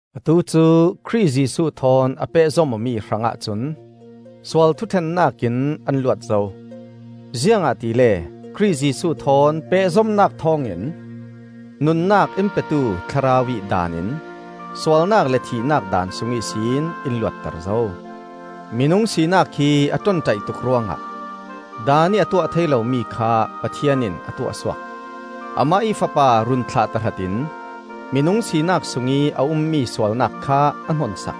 Atu cu Khrih Jesuh thawn a pehzom awmi hrangah cun sual thuṭhennak in an luat zo. Ziangahtile Khrih Jesuh thawn pehzomnak thawngin nunnak in petu Thlarau ih daan in sualnak le thihnak daan sung ihsin in luatter zo. Minung sinak hi a ṭonṭaih tuk ruangah Daan ih a tuah thei lomi kha Pathian in a tuah suak. Amah ih Fapa run thlah tahratin minung sinak sungih a ummi sualnak kha a hnonsak;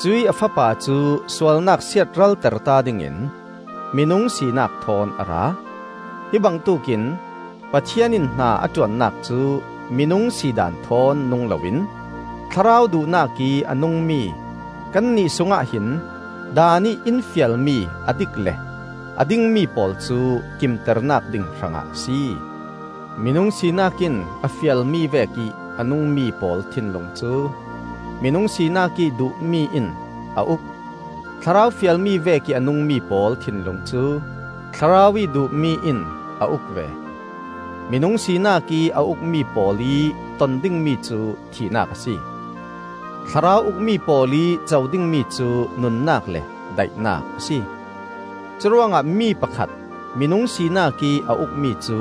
cuih a Fapa cu sualnak siatralterta dingin minung sinak thawn a ra. Hi bangtuk in Pathian in hna a ṭuannak cu minung sidaan thawn nung loin Thlarau duhnakih a nungmi kannih sungah hin Daan ih in fialmi a dik le a dingmi pawl cu kimternak ding hrangah a si. Minung sinak in a fialmi vekih a nungmi pawl thinlung cu minung sinak ih duhmi in a uk. Thlarau fialmi vekih a nungmi pawl thinlung cu Thlarau ih duhmi in a uk ve. Minung sinakih a ukmi pawl ih ton dingmi cu thihnak a si; Thlarau ukmi pawl ih co dingmi cu nunnak le daihnak a si. Curuangah mi pakhat minung sinakih a ukmi cu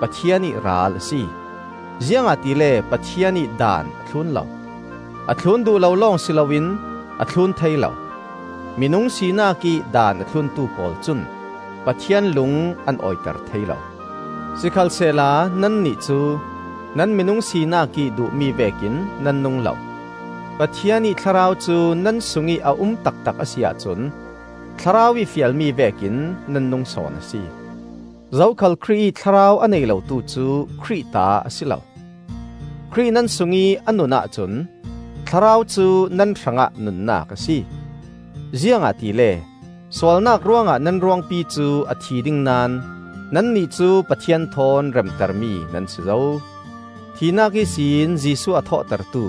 Pathian ih ral a si, ziangahtile Pathian ih daan a thlun lo; a thlun duh lo lawng si loin a thlun thei lo. Minung sinakih daan a thluntu pawl cun Pathian lung an awiter thei lo. Sikhalsehla nannih cu nan minung sinakih duhmi vekin nan nung lo; Pathian ih Thlarau cu nan sungih a um taktak a si ahcun Thlarau ih fialmi vekin nan nung sawn a si. Zokhal Khrih ih Thlarau a nei lotu cu Khrih ta a si lo. Khrih nan sungih a nun ahcun Thlarau cu nan hrangah nunnak a si; ziangahtile sualnak ruangah nan ruangpi cu a thi ding naón nannih cu Pathian thawn remtermi nan si zo. Thihnak ihsin Jesuh a thawhtertu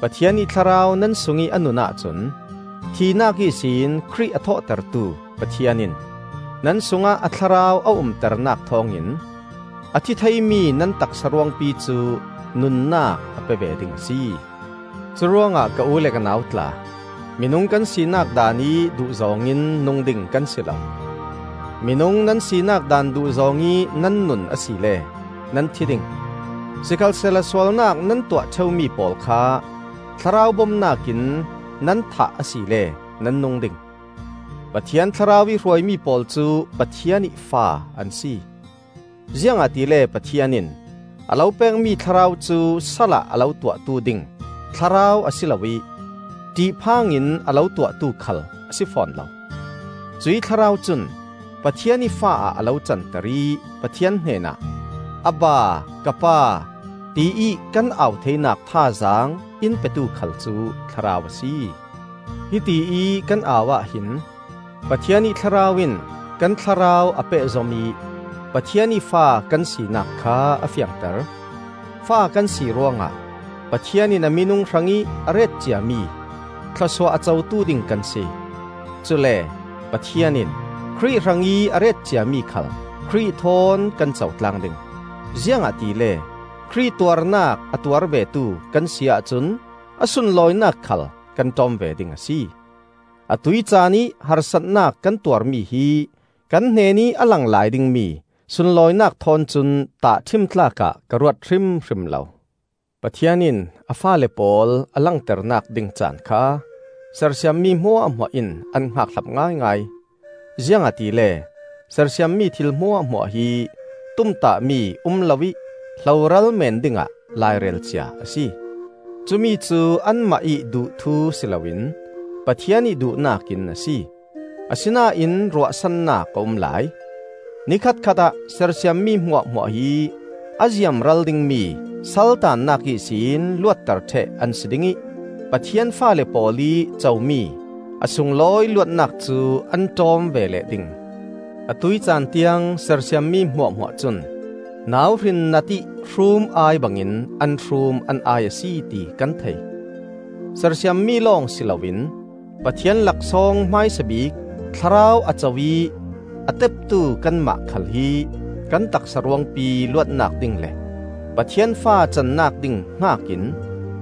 Pathian ih Thlarau nan sungih a nun ahcun thihnak ihsin Khrih a thawhtertu Pathian in nan sungah a Thlarau a umternak thawngin a thi theimi nan taksa ruangpi cu nunnak a pe ve ding a si. Curuangah ka u le ka nau tla, minung kan sinak daanih duhzawng in nung ding kan si lo. Minung nan sinak daan duhzawng ih nan nun asile nan thi ding; sikhalsehla sualnak nan tuah ṭheumi pawl kha Thlarau bomnak in nan thah asile nan nung ding. Pathian Thlarau ih hruaimi pawl cu Pathian ih fa an si. Ziangahtile Pathian in a lo pekmi Thlarau cu salah a lo tuahtu ding Thlarau a si lo ih ṭihphang in a lo tuahtu khal a si fawn lo. Cuih Thlarau cun Pathian ih fa ah a lo canter ih Pathian hnenah, “Abba, Ka Pa,” tiih kan au theinak thazaang in petu khal cu Thlarau a si. Hitiih kan au ahhin Pathian ih Thlarau in kan thlarau a pehzom ih Pathian ih fa kan sinak kha a fiangter. Fa kan si ruangah Pathian in a minung hrangih a retciami thlawsuah a cotu ding kan si; cule Pathian in Khrih hrangih a retciami khal Khrih thawn kan co tlang ding. Ziangahtile Khrih tuarnak a tuar vetu kan si ahcun a sunlawinak khal kan ṭawm ve ding a si. Atuih caanih harsatnak kan tuar mi hi kan hnenih a lang lai dingmi sunlawinak thawn cun tahṭhim tlak ah ka ruat hrimhrim lo. Pathian in a faale pawl a langternak ding caan kha sersiammi hmuahhmuah in an hngakhlap ngaingai. Ziangahtile sersiammi thil hmuahhmuah hi tumtahmi um loih hloral meen dingah lairel cia a si. Cumi cu anmah ih duh thu si loin Pathian ih duhnak in a si. Asinain ruahsannak a um lai. Nikhat khat ah sersiammi hmuahhmuah hi a ziamral dingmi saltaannak ihsin luatter ṭheh an si ding ih Pathian faale pawl ih comi a sunglawi luatnak cu an ṭawm ve leh ding. Atuih caan tiang sersiammi hmuahhmuah cun nauhrin natih hrum-ai bangin an hrum an ai a si ti kan thei. Sersiammi lawng si loin Pathian laksawng hmaisa bik Thlarau a co ih a teptu kanmah khal hi kan taksa ruangpi luatnak ding le Pathian fa cannak ding hngakin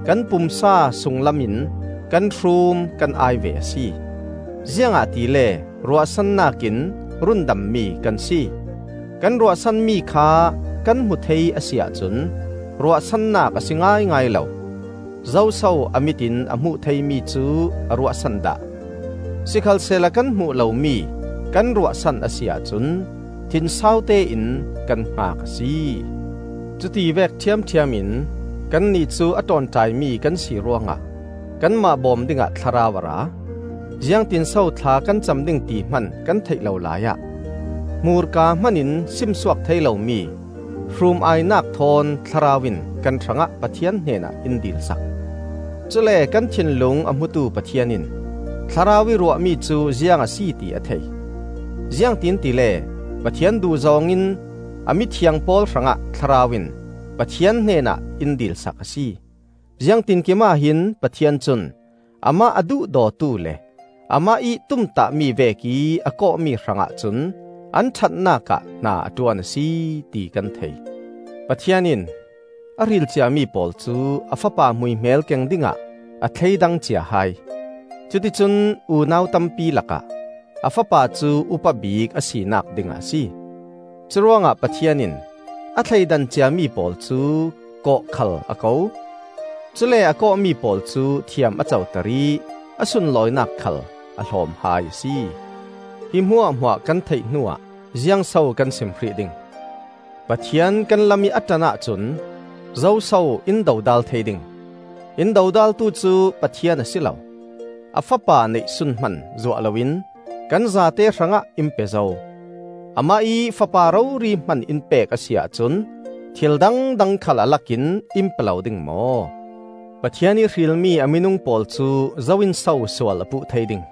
kan pumsa sunglam in kan hrum kan ai ve a si. Ziangahtile ruahsannak in rundammi kan si. Kan ruahsanmi kha kan hmu thei a si ahcun ruahsannak a si ngaingai lo. Zoso a mit in a hmuh theimi cu a ruahsan dah? Sikhalsehla kan hmuh lomi kan ruahsan a si ahcun thinsau tein kan hngak a si. Cuti vek ṭhiamṭhiam in kannih cu a ṭawnṭaimi kan si ruangah kanmah bawm dingah Thlarau a ra. Ziangtin so thla kan cam ding ti hman kan theih lo laiah, hmurka hmanin simsuak thei lomi hrum-ainak thawn Thlarau in kan hrangah Pathian hnenah in dil sak. Cule kan thinlung a hmutu Pathian in Thlarau ih ruahmi cu ziang a si ti a thei; ziangtin tile Pathian duhzawng in a mithiang pawl hrangah Thlarau in Pathian hnenah in dil sak a si. Ziangtinkim ahhin Pathian cun amah a duhdawtu le amah ih tumtahmi vekih a kawhmi hrangah cun an ṭhatnak ah hna a ṭuan a si, ti kan thei. Pathian in a hril ciami pawl cu a Fapa hmuihmel keng dingah a thleidang cia hai; cuti cun unau tampi lakah a Fapa cu upa bik a sinak dingah a si. Curuangah Pathian in a thleidan ciami pawl cu kawh khal a ko. Cule a kawhmi pawl cu thiam a coter ih a sunlawinak khal a hlawm hai a si. Hi hmuahhmuah kan theih hnuah ziangso kan sim hrih ding? Pathian kan lamih a ṭan ahcun zoso in dodal thei ding? In dodaltu cu Pathian a si lo, a Fapa neihsun hman zuah loin kan zate hrangah in pe zo! Amah ih Fapa rori hman in pek a si ahcun thil dangdang khal a lakin in pe lo ding maw? Pathian ih hrilmi a minung pawl cu zo in so sual a puh thei ding?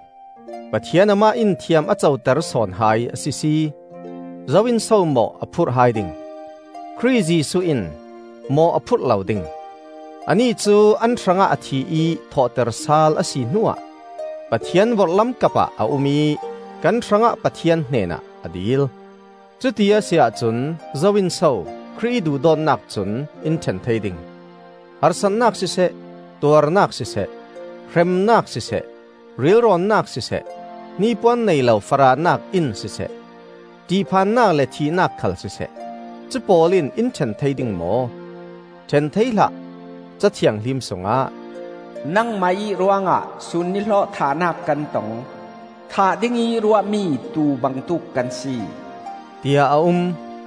Pathian amah in thiam a coter sawn hai a sisi! Zo in so mawh a phurh hai ding? Khrih Jesuh in mawh a phurh lo ding; anih cu an hrangah a thi ih thawhter sal a si hnuah Pathian vorhlam kapah a um ih kan hrangah Pathian hnenah a dil. Cuti a si ahcun zo in so Khrih ih duhdawtnak cun in ṭhen thei ding? Harsatnak siseh, tuarnak siseh, hremnak siseh, rilrawnnak siseh, hnipuan neilo farahnak in siseh, ṭihphannak le thihnak khal siseh, cupawl in in ṭhen thei ding maw? ṭhen thei hlah! Ca Thianghlim sungah, “Nangmah ih ruangah sun nihlawh thahnak kan tong; Thah dingih ruahmi tuu bangtuk kan si,” tiah a um.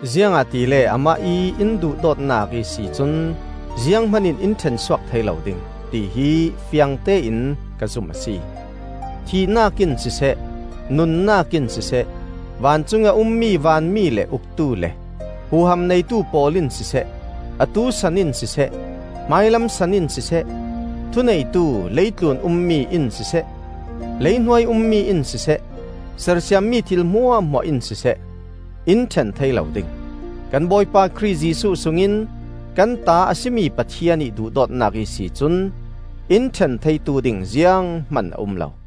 Ziangahtile amah ih in duhdawtnak ihsi cun zianghman in in ṭhensuak thei lo ding, tihi fiangtein ka zum a si; thihnak in siseh, nunnak in siseh, vancungih a ummi vanmi le uktu le huham neitu pawl in siseh, atu san in siseh, hmailam san in siseh, thuneitu leitlun ummi in siseh, leihnuai ummi in siseh, sersiammi thil hmuahhmuah in siseh, in ṭhen thei lo ding. Kan Bawipa Khrih Jesuh sungin kan ta a si mi Pathian ih duhdawtnak ihsi cun in ṭhen theitu ding zianghman a um lo.